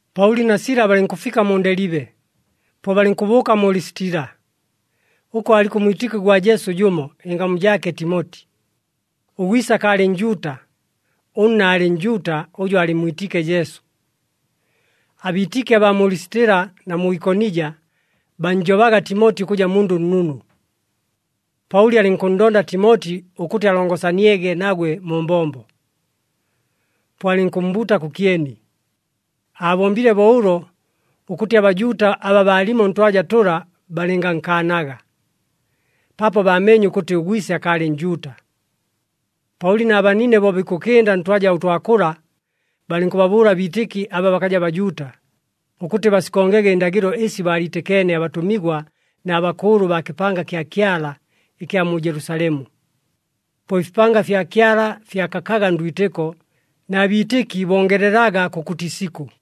Paʉli na Sila balɨnkʉfika mu Ndelibe, po balɨnkʉbʉʉka mu Lisitila. Ʉko aaliko ʉmwitɨki gwa Jesu jʉmo, ɨngamu jaake Timoti. Ʉgwise akaalɨ Njuuta, ʉnna aalɨ Njuuta ʉjʉ aalɨmmwitiike Jesu. Abiitɨki abaa mu Lisitila na mu Ikonija, bannjobaga Timoti ʉkʉja mundʉ nnunu. Paʉli alɨnkʉnndonda Timoti ʉkʉtɨ alongosaniege nagwe mu mbombo. Po alɨnkʉmmbuuta kʉkyeni. Aabombile bo ʉlo ʉkʉtɨ aBajuuta aba balimo ntwaja tʉla balɨngankaanaga, paapo baameenye ʉkʉtɨ ʉgwise akaalɨ Njuuta. Paʉli na banine bo bikʉkɨnda ntwaja ʉtwa kʉla, balɨnkʉbabʉʉla abiitɨki aba bakaja Bajuuta, ʉkʉtɨ basikongege ɨndagɨlo ɨsi baaliitɨkeene abatʉmigwa na bakʉʉlʉ baa kɨpanga kya Kyala ɨkya mu Jelusalemu. Po ɨfipanga fya Kyala fyakakaga ndwitɨko, na biitɨki bongelelaga kʉkʉtɨ isikʉ.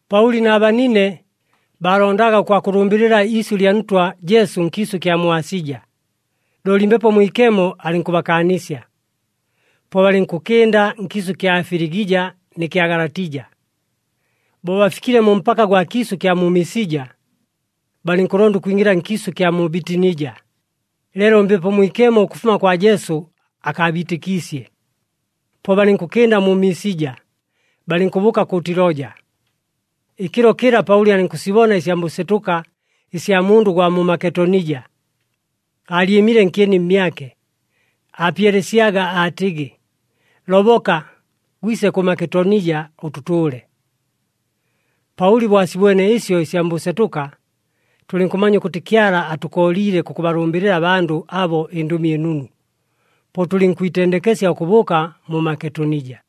Paʉli na banine, baalondaga ʉkwakʉlʉmbɨlɨla iisyʉ lya Ntwa Jesu nkiisʉ ɨkya mu Asija, looli Mbepo Mwikemo alɨnkʉbakaanisya. Po balɨnkʉkɨnda nkiisʉ ɨkya Filigija nɨ kya Galatija. Bo bafikile mu mpaka gwa kiisʉ ɨkya mu Misija, balɨnkʉlonda ʉkwingɨla nkiisʉ ɨkya mu Bitinija, leelo Mbepo Mwikemo ʉkʉfuma kwa Jesu akaabiitɨkiisye. Po balɨnkʉkɨnda mu Misija, balɨnkʉbʉʉka kʉ Tiloja. Ɨkɨlo kɨla, Paʉli alɨnkʉsibona ɨsya mbʉsetʉka ɨsya mundʉ ʉgwa mu Maketonija, aalyɨmile nkyeni mmyake, aapyelesyaga, aatɨgɨ, “Loboka, gwise kʉ Maketonija, ʉtʉtʉʉle.” Paʉli bo asibwene ɨsyo ɨsya mbʉsetʉka, tʉlɨnkʉmanya ʉkʉtɨ Kyala aatʉkooliile kʉkʉbalʉmbɨlɨla abandʉ abo ɨNdʉmi ɨNunu, po tʉlɨnkwitendekesya ʉkʉbʉʉka mu Maketonija.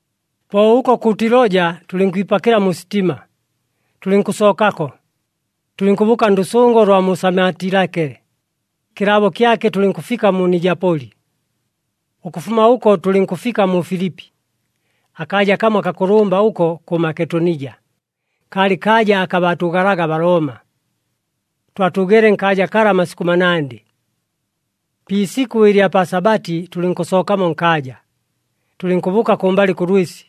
Po ʉko kʉ Tiloja, tʉlɨnkwipakɨla mu sitima, tʉlɨnkʉsookako, tʉlɨnkʉbʉʉka ndʉsʉngo lwa mu Samatilake, kɨlaabo kyake tʉlɨnkʉfika mu Nijapoli. Ʉkʉfuma ʉko tʉlɨnkʉfika mu Filipi, akaaja kamo akakʉlʉmba ʉko kʉ Maketonija, kaalɨ kaaja aka baatʉʉgalaga aBalooma. Twatʉʉgeele nkaaja kala amasikʉ manandɨ. Pi isikʉ ɨlya pa Sabati tʉlɨnkʉsookamo nkaaja, tʉlɨnkʉbʉʉka kʉmbalɨ kʉ lwɨsi,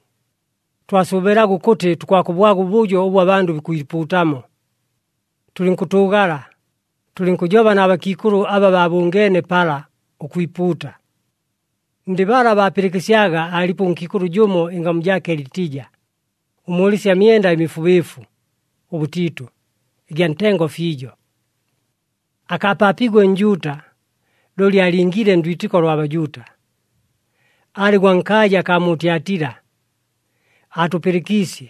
twasʉʉbɨlaga ʉkʉtɨ tukwakʉbwaga ʉbʉjo ʉbʉ abandʉ bikwipuutamo. Tʉlɨnkʉtʉʉgala, tʉlɨnkʉjoba na bakiikʉlʉ aba baabʉngeene pala, ʉkwipuuta. Ndɨ bala baapɨlɨkɨsyaga aalipo ʉnkiikʉlʉ jʉmo, ɨngamu jaake Litija, ʉmʉʉlɨsya myenda ɨmifubɨɨfu ʉbʉtiitʉ ɨgya ntengo fiijo. Akaapaapiigwe Njuuta, looli aalingiile ndwitɨko lwa Bajuuta, aalɨ gwa nkaaja akaa mu Tyatila. Aatʉpɨlɨkiisye,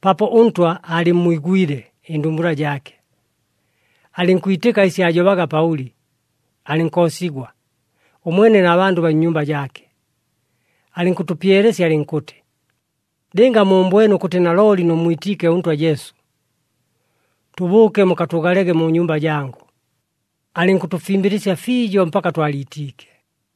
paapo ʉNtwa aalɨmmwigwile ɨndumbula jaake, alɨnkwitɨka ɨsi aajobaga Paʉli. Alɨnkoosigwa, ʉmwene na bandʉ baa nnyumba jaake, alɨnkʉtʉpyelesya alɨnkʉtɨ, “Lɨnga muumbwene ʉkʉtɨ nalooli nʉmmwitiike ʉNtwa Jesu, tʉbʉʉke mukatʉʉgalege mu nyumba jangʉ.” Alɨnkʉtʉfimbɨlɨsya fiijo mpaka twaliitiike.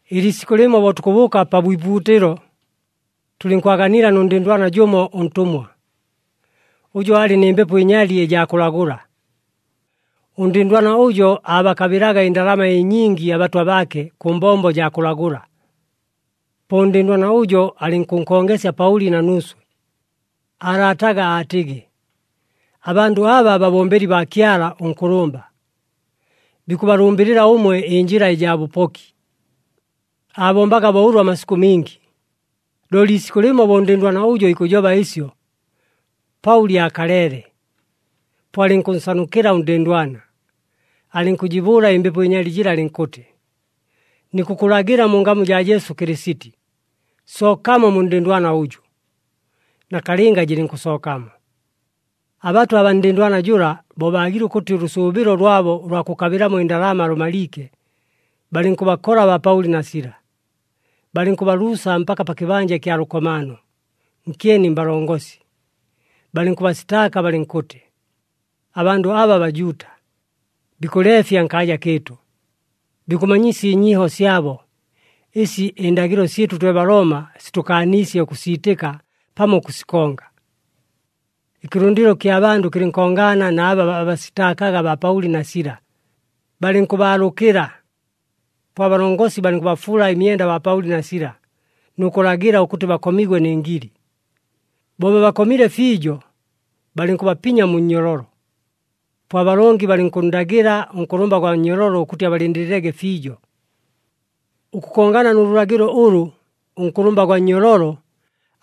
Ɨliisikʉ lɨmo bo tukʉbʉʉka pa bwipuutɨlo, tʉlɨnkwaganila nʉ ndɨndwana jʉmo ʉntʉmwa, ʉjʉ aalɨ nɨ mbepo ɨnyali ɨjaa kʉlagʉla. Ʉndɨndwana ʉjo aabakabɨlaga ɨndalama ɨnyingi abatwa baake kʉ mbombo jaa kʉlagʉla. Po ʉndɨndwana ʉjo alɨnkʉnkongesya Paʉli na nuuswe, aalaataga aatɨgɨ, “Abandʉ aba babombeli baa Kyala ʉNkʉlʉmba, bikʉbalʉmbɨlɨla ʉmwe ɨnjɨla ɨjaa bʉpoki!” Aabombaga bo ʉlo amasikʉ mingi. Looli iisikʉ lɨmo bo ʉndɨndwana ʉjo ikʉjoba ɨsyo, Paʉli aakaleele. Po alɨnkʉnsanukɨla ʉndɨndwana, alɨnkʉjɨbʉʉla ɨmbepo ɨnyali jɨla alɨnkʉtɨ, “Nikʉkʉlagɨla mu ngamu jaa Jesu Kɨlɨsiti, sookamo mu ndɨndwana ʉjʉ!” Nakalɨnga jɨlɨnkʉsookamo. Abatwa abaa ndɨndwana jʉla, bo baagile ʉkʉtɨ ʉlʉsʉʉbɨlo lwabo ʉlwa kʉkabɨlamo ɨndalama lʉmaliike, balɨnkʉbakola baa Paʉli na Sila, balɨnkʉbaluusa mpaka pa kɨbanja ɨkya lʉkomaano, nkyeni mbalongosi. Balɨnkʉbasitaaka balɨnkʉtɨ, “Abandʉ aba Bajuuta, bikʉleefya nkaaja kɨɨtʉ. Bikʉmanyisya ɨnyiiho syabo, ɨsi ɨndagɨlo syɨtʉ twe Balooma sitʉkaaniisye ʉkʉsiitɨka pamo ʉkʉsikonga.” Ɨkɨlʉndɨlo ɨkya bandʉ kɨlɨnkongaana na aba baabasitaakaga baa Paʉli na Sila, balɨnkʉbaalʉkɨla. Po abalongosi balɨnkʉbafuula ɨmyenda baa Paʉli na Sila, nʉ kʉlagɨla ʉkʉtɨ bakomigwe nɨ ngili. Bo babakomile fiijo, balɨnkʉbapinya mu nnyololo, po abalongi balɨnkʉnndagɨla ʉnkʉlʉmba gwa nnyololo ʉkʉtɨ abalɨndɨlɨlege fiijo. Ʉkʉkongana nʉ lʉlagɨlo ʉlʉ, ʉnkʉlʉmba gwa nnyololo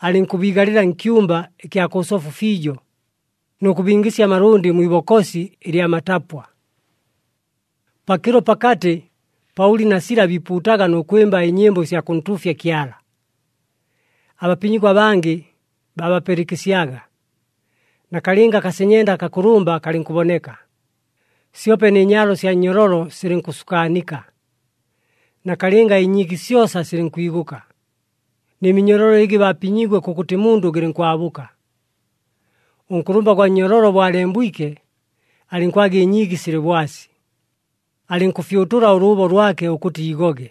alɨnkʉbiigalɨla nkyumba ɨkya kʉ sofu fiijo, nʉ kʉbingɨsya amalʉndɨ mwi ibokosi ɨlya matapwa. Pakɨlo pakatɨ, Paʉli na Sila biipuutaga nʉ kwɨmba ɨnyɨmbo ɨsya kʉntuufya Kyala. Abapinyigwa abangɨ babapɨlɨkɨsyaga. Nakalɨnga akasenyenda akakʉlʉmba kalɨnkʉboneka, syope nɨ nyaalo sya nnyololo silɨnkʉsukaanika. Nakalɨnga ɨnyiigi syosa silɨnkwigʉka, nɨ minyololo ɨgɨ baapinyiigwe kʉkʉtɨ mundʉ gɨlɨnkwabʉka. Ʉnkʉlʉmba gwa nnyololo bo alembwike, alɨnkwaga ɨnyiigi silɨ bwasi. Alɨnkʉfyʉtʉla ʉlʉʉbo lwake ʉkʉtɨ iigoge,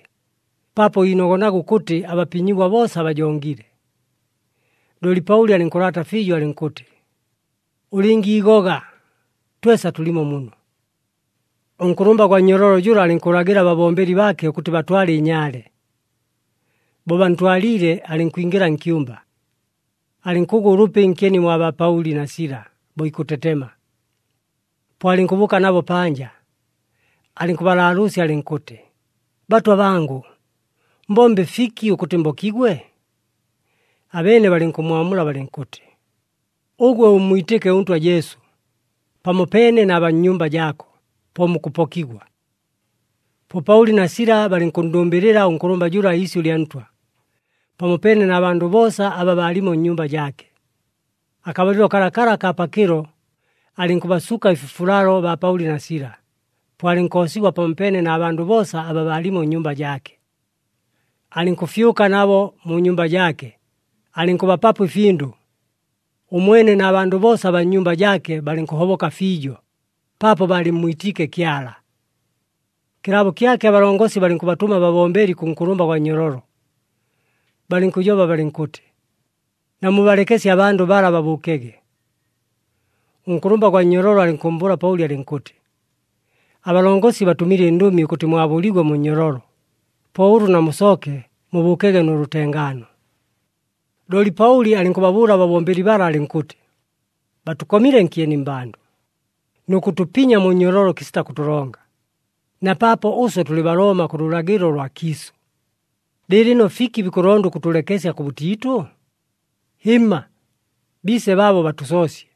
paapo iinogonaga ʉkʉtɨ abapinyigwa boosa bajongile. Looli Paʉli alɨnkʉlaata fiijo alɨnkʉtɨ, “Ʉlɨngiigoga, twesa tʉlimo muno.” Ʉnkʉlʉmba gwa nnyololo jʉla alɨnkʉlagɨla ababombeli baake ʉkʉtɨ batwale ɨnyaale. Bo bantwaliile, alɨnkwingɨla nkyumba, alɨnkʉgwa ʉlʉpi nkyeni mwa baa Paʉli na Sila bo ikʉtetema. Po alɨnkʉbʉʉka nabo panja, alɨnkʉbalaalʉʉsya alɨnkʉtɨ, “Batwa bangʉ, mbombe fiki ʉkʉtɨ mbokigwe?” Abeene balɨnkʉmmwamula balɨnkʉtɨ, “Ʉgwe ʉmmwitɨke ʉNtwa Jesu, pamopeene na baa nnyumba jaako, po mukʉpokigwa.” Po Paʉli na Sila balɨnkʉnndʉmbɨlɨla ʉnkʉlʉmba jʉla iisyʉ lya Ntwa, pamopeene na bandʉ boosa aba baalimo nnyumba jaake. Akabalɨlo kalakala akaa pakɨlo, alɨnkʉbasuka ɨfifulalo baa Paʉli na Sila, po alɨnkoosigwa pamopeene na bandʉ boosa aba baalimo nnyumba jaake. Alɨnkʉfyʉka nabo mu nyumba jaake, alɨnkʉbapapo ɨfindʉ. Ʉmwene na bandʉ boosa abaa nnyumba jaake balɨnkʉhoboka fiijo, paapo baalɨmmwitiike Kyala. Kɨlaabo kyake abalongosi, balɨnkʉbatʉma ababombeli kʉ nkʉlʉmba gwa nnyololo, balɨnkʉjoba balɨnkʉtɨ, “Namubalekesye abandʉ bala babʉʉkege.” Ʉnkʉlʉmba gwa nnyololo alɨnkʉmmbʉʉla Paʉli alɨnkʉtɨ, “Abalongosi batʉmile ɨndʉmi, ʉkʉtɨ mwabʉligwe mu nnyololo. Po ʉlʉ namusooke, mubʉʉkege nʉ lʉtengaano.” Looli Paʉli alɨnkʉbabʉʉla ababombeli bala alɨnkʉtɨ, “Batʉkomile nkyeni mmbandʉ, nʉ kʉtʉpinya mu nnyololo kɨsita kʉtʉlonga, na paapo ʉswe tʉlɨ Balooma kʉ lʉlagɨlo lwa kiisʉ. Lɨɨlɨno fiki bikʉlonda ʉkʉtʉlekesya kʉbʉtiitʉ? Hɨmma! Biise baabo batʉsoosye.”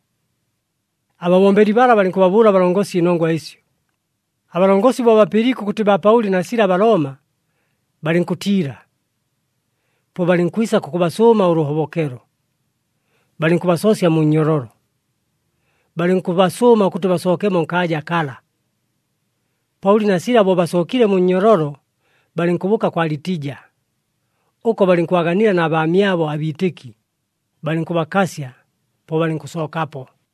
Ababombeli bala balɨnkʉbabʉʉla abalongosi ɨnongwa ɨsyo. Abalongosi bo bapɨliike ʉkʉtɨ baa Paʉli na Sila Balooma, balɨnkʉtiila. Po balɨnkwisa kʉkʉbasʉʉma ʉlʉhobokelo. Balɨnkʉbasoosya mu nnyololo, balɨnkʉbasʉʉma ʉkʉtɨ basookemo nkaaja kala. Paʉli na Sila bo basookile mu nnyololo, balɨnkʉbʉʉka kwa Litija. Ʉko balɨnkwaganila na baamyabo abiitɨki, balɨnkʉbakasya, po balɨnkʉsookapo.